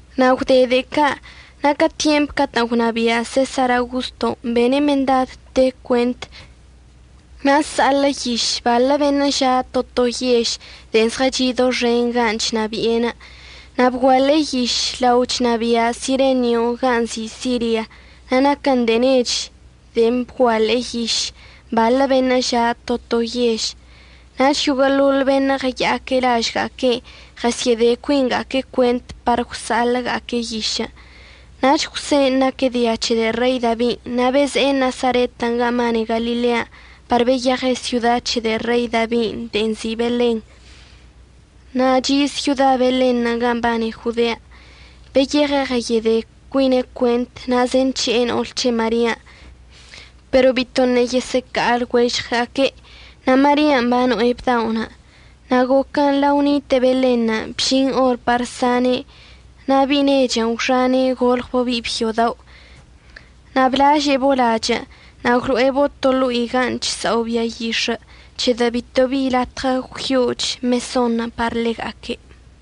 Na' gwde de'e ca', na' ca tyempən' catə'ən gwnabia' Sesar Augosto, bene' mendad te cuent na' əsa'aḻə' yiš baḻə beṉə' ža' to to yež de'e zɉəchi' doxen ganə' chnabi'e. Na' bguaḻe'e yišən' lao chnabia' Sirenio gan' nzi' Siria. Na' naquən de'e nech de'en bguaḻe'e yiš baḻə beṉə' ža' to to yež. Nach yoguə'əḻoḻ beṉə' ɉəya'aque' lažga'aque' ɉəsyə'əde cuinga'aque' cuent par gwsa'aḻə'əga'aque' yiš. Nach Jwsen' naque' dia c̱he de'e Rei Dabin'. Na' beze'e Nasaret gan' mbane Galilean' par beyeɉe' syoda c̱he de'e Rei Dabin' de'e nzi' Belen. Na' chi' syoda Belenṉə' gan' mbane Jodean'. Beyeɉe' ɉəyede cuine' cuent na' zenc̱he'e no'ol c̱he' Marian', pero bitoṉə' yesə'əca'a lɉuežɉe'. Na' Marian' bano'e bda'onə'. Na' goquən' lao nite'e Belenṉə' bžin or par sane'. Na' bi'i nechən' gwxane' golɉbo' bi'i byo dao', na' blaže'ebo' lachə'. Na' gwlo'ebo' to ḻo'i gan' chsa'o bia yix̱ə', c̱hedə' bito bi latɉə gwyo'och mesonṉə' par ḻega'aque'.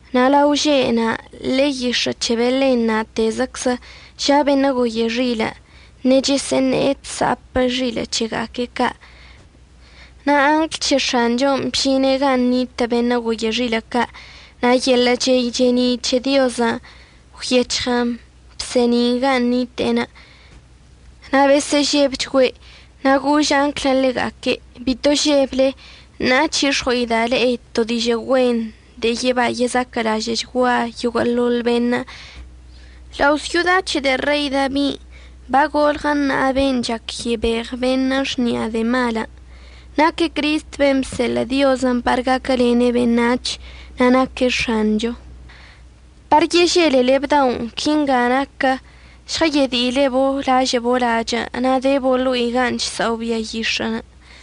Na' lao že' na', ḻe'e yix̱ə' c̱he Belen na'atezəczə ža' beṉə' goye xilə' ṉechəsə'əṉe'e chsa'ape' xilə' c̱hega'aque' ca'. Na' angl c̱he X̱anchon' bžine' gan' nitə' beṉə' goye xilə' ca', na' yeḻə' chey che'eni' c̱he Diozən' gwyec̱hɉən bse'eni'in gan' nite'enə'. Na' besə'əžebchgüe'. Na' gož anglən' ḻega'aque': ―Bito žeble, ṉa'a c̱hix̱ɉo'ida' le'e to dižə' güen de'e yeba yezaquə'əlažə'əchgua yoguə'əḻoḻ beṉə'. Lao' syoda c̱he de'e Rei Dabin' bagolɉə ṉa'a ben' chac yebeɉ beṉə' xni'a de'e malən'. Naque' Cristən' ben' bseḻə' Diozən' par gaquəlene' beṉac̱hən' na' naque' X̱anchon'. Par yeželele bda'onə' quinga naquə: Žɉəyedi'ilebo' lažə'əbo' lachə' na' debo' ḻo'i gan' chsa'o bia yix̱ə'.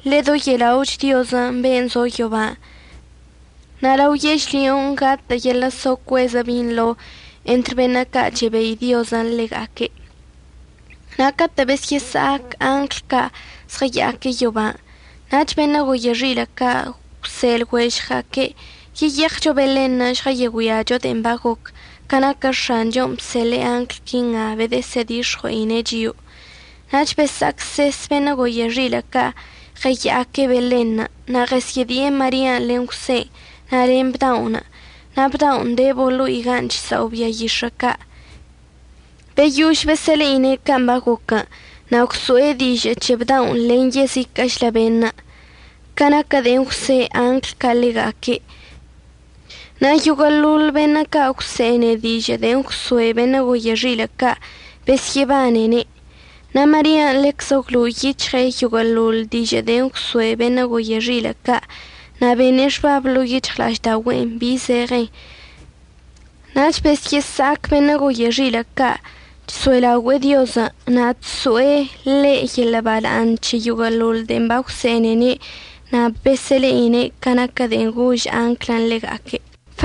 Ḻedoye'ela'och Diozən' ben' zo yoban'. Na' lao yežlyon' gatə' yeḻə' so cuezə binḻo entr beṉə' ca' chebei Diozən' ḻega'aque'. Na' catə' besyə'əsa'ac angl ca' zɉəya'aque' yoban', nach beṉə' goye xilə' ca' gwse' lɉuežɉga'aque': ―Yeyeɉcho Belenṉə' žɉəyegüiacho de'en bagoc, ca naquə X̱anchon' bseḻe'e angl quinga bedəsə'ədix̱ɉue'ine' chio'o. Nach besa'acses beṉə' goye xilə' ca' ɉəya'aque' Belenṉə', na' ɉəsyə'ədi'e Marian' len Jwsen' na' len bda'onə'. Na' bda'onə' debo' ḻo'i gan' chsa'o bia yix̱ə' ca'. Beyož besə'əle'ine' can' bagoquən', na' gwso'e dižə' c̱he bda'onə' len yeziquə'əchlə beṉə' ca naquə de'en gwse' angl ca' ḻega'aque'. Na' yoguə'əḻoḻ beṉə' ca' əgwse'ene dižə' de'en gwsoe' beṉə' goye xilə' ca' besyə'əbanene'. Na' Marian' ḻeczə gwlo'o yic̱hɉe' yoguə'əḻoḻ dižə' de'en gwsoe' beṉə' goye xilə' ca' na' bene' xbab ḻo'o yic̱hɉla'aždaogüe'en bi zeɉenṉə'. Nach besyə'əsa'ac beṉə' goye xilə' ca' chso'elaogüe'e Diozən' na' chso'e ḻe' yeḻə' bala'aṉ c̱he yoguə'əḻoḻ de'en bagwse'enene' na' babesə'əle'ine' ca naquə de'en gož anglən' ḻega'aque'.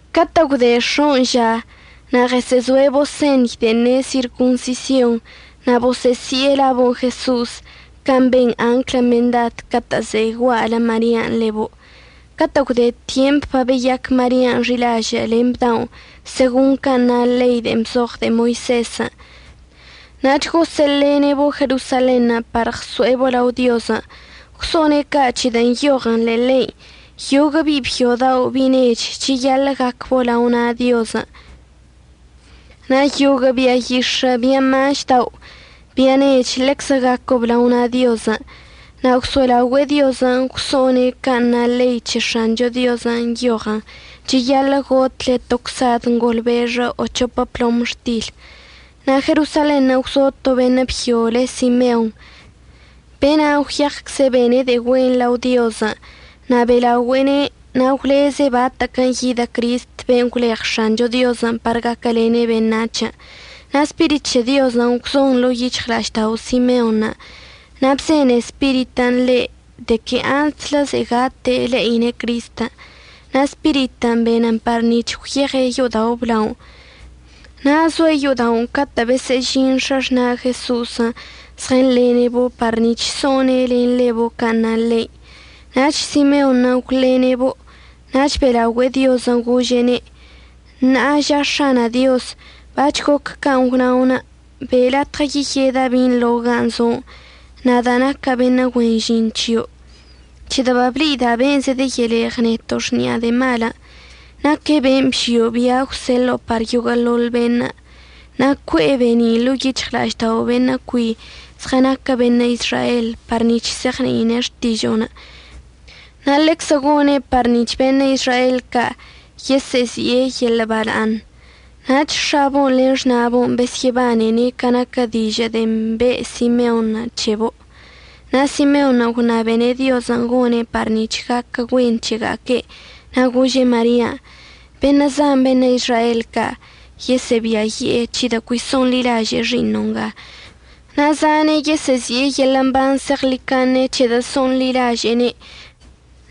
Catə' gwde x̱on' ža na' ɉəsə'əzo'ebo' señy de'en ne' sirconsision na' bosə'əsi'e labo' Jeso'os, can' ben anglən' mendad catə' ze'e gua'alə Marian' ḻebo'. Catə' gwde tyempən' babeyac Marian' xi'ilažə' len bda'onə' segon can' na ḻein' de'en bzoɉ de'e Moisezən', nach gosə'əlene'ebo' Jerosalenṉə' par ɉso'ebo' lao Diozən'. Gwso'one' ca' c̱hedə' nyoɉən ḻe'e ḻein': “Yoguə' bi'i byo dao' bi'i nech cheyaḻə' gacbo' lao na' Diozən', na' yoguə' bia yix̱ə' bia maš dao' bia nech ḻeczə gaquəb lao na' Diozən'.” Na' gwso'elaogüe'e Diozən' gwso'one' can' na ḻei c̱he X̱ancho Diozən', nyoɉən: “Cheyaḻə' gotle to csad ngolbexə o c̱hopə plomxtil.” Na' Jerosalenṉə' gwzo to beṉə' byo le Simeon. Be'enan' gwyecze' bene' de'e güen lao Diozən' na' be'elaogüe'ene', na' gwleze' batə'əquən' yidə Cristən' ben' gwleɉ X̱ancho Diozən' par gaquəlene' beṉac̱hən'. Na' Spirit c̱he Diozən' gwzon ḻo'o yic̱hɉla'aždao' Simeonṉə'. Na' bzene Spiritən' ḻe' de que antslə ze'e gate' le'ine' Cristən'. Na' Spiritən' benən par nic̱h gwyeɉe' yo'odao' əblaonə'. Na' zoe' yo'oda'onə' catə' besə'əžin x̱axna' Jeso'osən' zɉənḻene'ebo' par nic̱h so'one' len ḻebo' can' na ḻein'. Nach Simeonṉə' gwḻene'ebo', nach be'elaogüe'e Diozən' gože'ene': Ṉa'a ža X̱ana' Dioz, bac̱h goc can' gwna'onə'. Be' latɉə yeyeda' binḻo gan' zo'onə', nada' naca' beṉə' güen žin c̱hio', c̱hedə' bable'ida' ben' zedəyeleɉ neto' xni'a de'e malən'. Naque' ben' bžio' bia' əgwseḻo'o par yoguə'əḻoḻ beṉə'. Na' cue'e be'eni' ḻo'o yic̱hɉla'aždao' beṉə' cui zɉənaquə beṉə' Izrael par nic̱h se'eɉni'ine' xtižo'onə'. Na' ḻeczə gone' par nic̱h beṉə' Izrael ca' yesə'əzi'e yeḻə' bala'aṉ. Nach x̱abo'on len xna'abo'on besyə'əbanene' ca naquə dižə' de'en be' Simeonṉə' c̱hebo'. Na' Simeonṉə' gwṉabene' Diozən' gone' par nic̱h gaquə güen c̱hega'aque', na' gože' Marian': ―Beṉə' zan beṉə' Izrael ca' yesə'əbiayi'e c̱hedə' cui so'onḻilaže'e xi'iṉo' nga, na' zane' yesə'əzi'e yeḻə' mban zeɉḻicaṉe c̱hedə' so'onḻilaže'ene',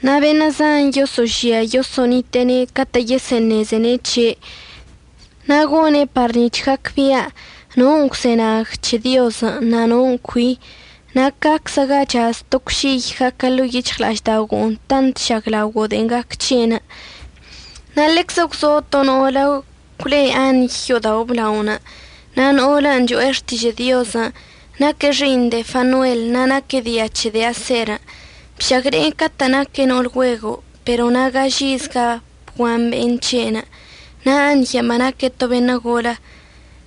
na' beṉə' zan yoso'ožia yoso'onite'ene' catə' yesəṉezene' c̱he'. Na' gone' par nic̱h gacbia' non' əgwzenag c̱he Diozən' na' non' cui. Na' caczə ga chaz to cwšiy gaquə ḻo'o yic̱hɉla'aždaogo'onə' tant əžaglaogo' de'en gac c̱he'. Na' ḻeczə gwzo to no'olə gwle Añy yo'odao' əblaonə', na' no'olən' cho'e xtižə' Diozən'. Naque' xi'iṉ de'e Fanuel, na' naque' dia c̱he de'e Aser. Bšagne'e catə'ən naque' no'ol güego', pero na' gaž izga bguan be'en c̱he'enə'. Na' Añyən' banaque' to beṉə' golə.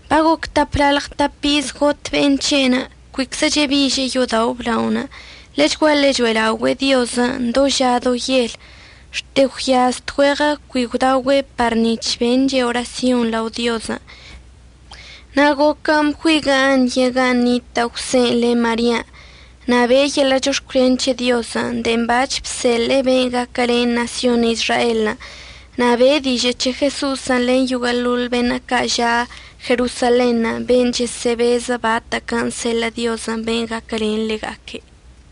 Bagoc taplalɉ tap iz got be'en c̱he'enə'. Cuiczə chebiže'e yo'odao' əblaonə'. Ḻechguaḻe cho'elaogüe'e Diozən' do ža do yel, xte gwyaz tgüeɉə cui gwdaogüe' par nic̱h benche' orasyon lao Diozən'. Na' goquən' bgüiguə' Añyən' gan' nitə' Jwsen' len Marian', na' be'e yeḻə' chox̱cwlen c̱he Diozən' de'en bac̱h bseḻe'e ben' gaquəlen ṉasyon Izraelən'. Na' be'e dižə' c̱he Jeso'osən' len yoguə'əḻoḻ beṉə' ca' ža' Jerosalenṉə' beṉə' chesə'əbeze' batə'əquən' əseḻə' Diozən' ben' gaquəlene' ḻega'aque'.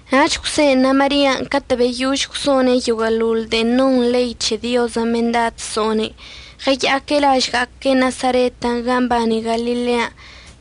Nach Jwsen' na' Marian' catə' beyož gwso'one' yoguə'əḻoḻ de'en non ḻei c̱he Diozən' mendad so'one', ɉəya'aque' lažga'aque' Nasaret gan' mbane Galilean'.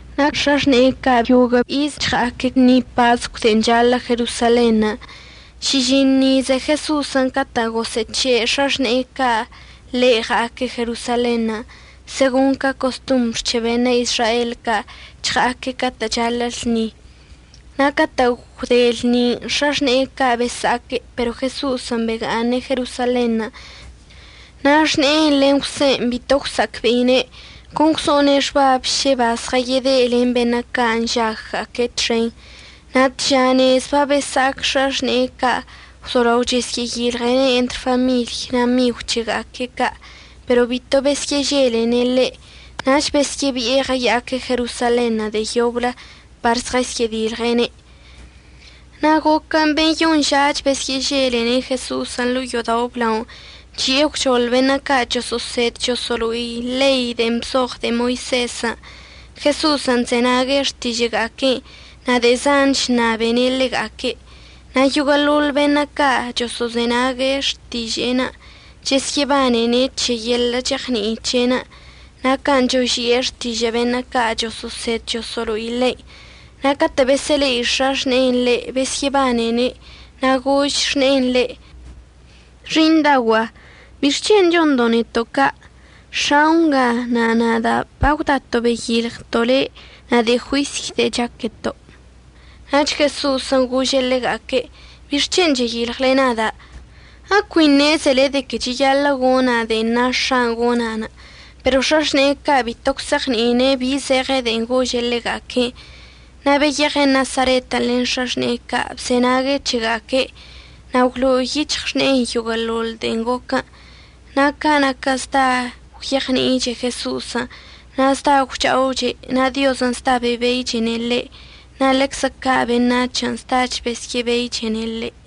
Na' x̱axne'e ca' yoguə' iz chɉa'aque' lṉi pascw de'en chaḻə' Jerosalenṉə'. Šižiṉ ize Jeso'osən' catə' gosə'əc̱he' x̱axne'e ca' ḻe' ɉa'aque' Jerosalenṉə'. Segon ca costombr c̱he beṉə' Izrael ca' chɉa'aque' catə' chaḻə' lṉin'. Na' catə' gwde lṉinə' x̱axne'e ca' besa'aque', pero Jeso'osən' bega'aṉe' Jerosalenṉə'. Na' xne'enə' len Jwsen' bito gwsa'acbe'ine', con gwso'one' xbab šə bazɉəyede' len beṉə' ca' nžagga'aque' txenṉə'. Na' tža nez babesa'ac x̱axne'e ca' gwzolao chəsyə'əyilɉe'ene' entr famiḻy na' migw c̱hega'aque' ca'. Pero bito besyə'əželene' ḻe', nach besyə'əbi'e ɉəya'aque' Jerosalenṉə' de'e yoblə par žɉəsyə'ədilɉe'ene'. Na' goquən' beyoṉ žach besyə'əželene' Jeso'osən' ḻo'o yo'odao' əblaonə', chi'e gwchoḻ beṉə' ca' choso'osed choso'olo'i ḻei de'en bzoɉ de'e Moisezən'. Jeso'osən' chzenague' xtižə'əga'aque'enə' na' de'e zan chṉabene' ḻega'aque'. Na' yoguə'əḻoḻ beṉə' ca' choso'ozenag xtiže'enə' chəsyə'əbanene' c̱he yeḻə' cheɉni'i c̱he'enə' na' can' choži'e xtižə' beṉə' ca' choso'osed choso'olo'i ḻein'. Na' catə' besə'əle'i x̱axne'en ḻe' besyə'əbanene', na' gož xne'en ḻe': ―Xi'iṉdaogua'a, ¿bixc̱hen' chondo' neto' ca'? X̱ao' nga na' nada' bagwdato' beyilɉto' le' na' de'e juisy de'e chaqueto'. Nach Jeso'osən' gože' ḻega'aque': ―¿Bixc̱hen' cheyilɉle nada'? ¿Ecui ṉezele de que cheyaḻə' gona' de'en na X̱a'anə' gona'anə'? Pero x̱axne'e ca' bito gwse'eɉni'ine' bi zeɉe de'en gože' ḻega'aque'enə'. Na' beyeɉe' Nasaretən' len x̱axne'e ca', bzenague' c̱hega'aque'. Na' gwlo'o yic̱hɉ xne'enə' yoguə'əḻoḻ de'en goquən'. Na' ca naquə zda gwyeɉni'iche Jeso'osən' na' zda gwcha'oche', na' Diozən' zda bebeichene' ḻe' na' ḻeczə ca' beṉac̱hən' zdach besyə'əbeichene' ḻe'.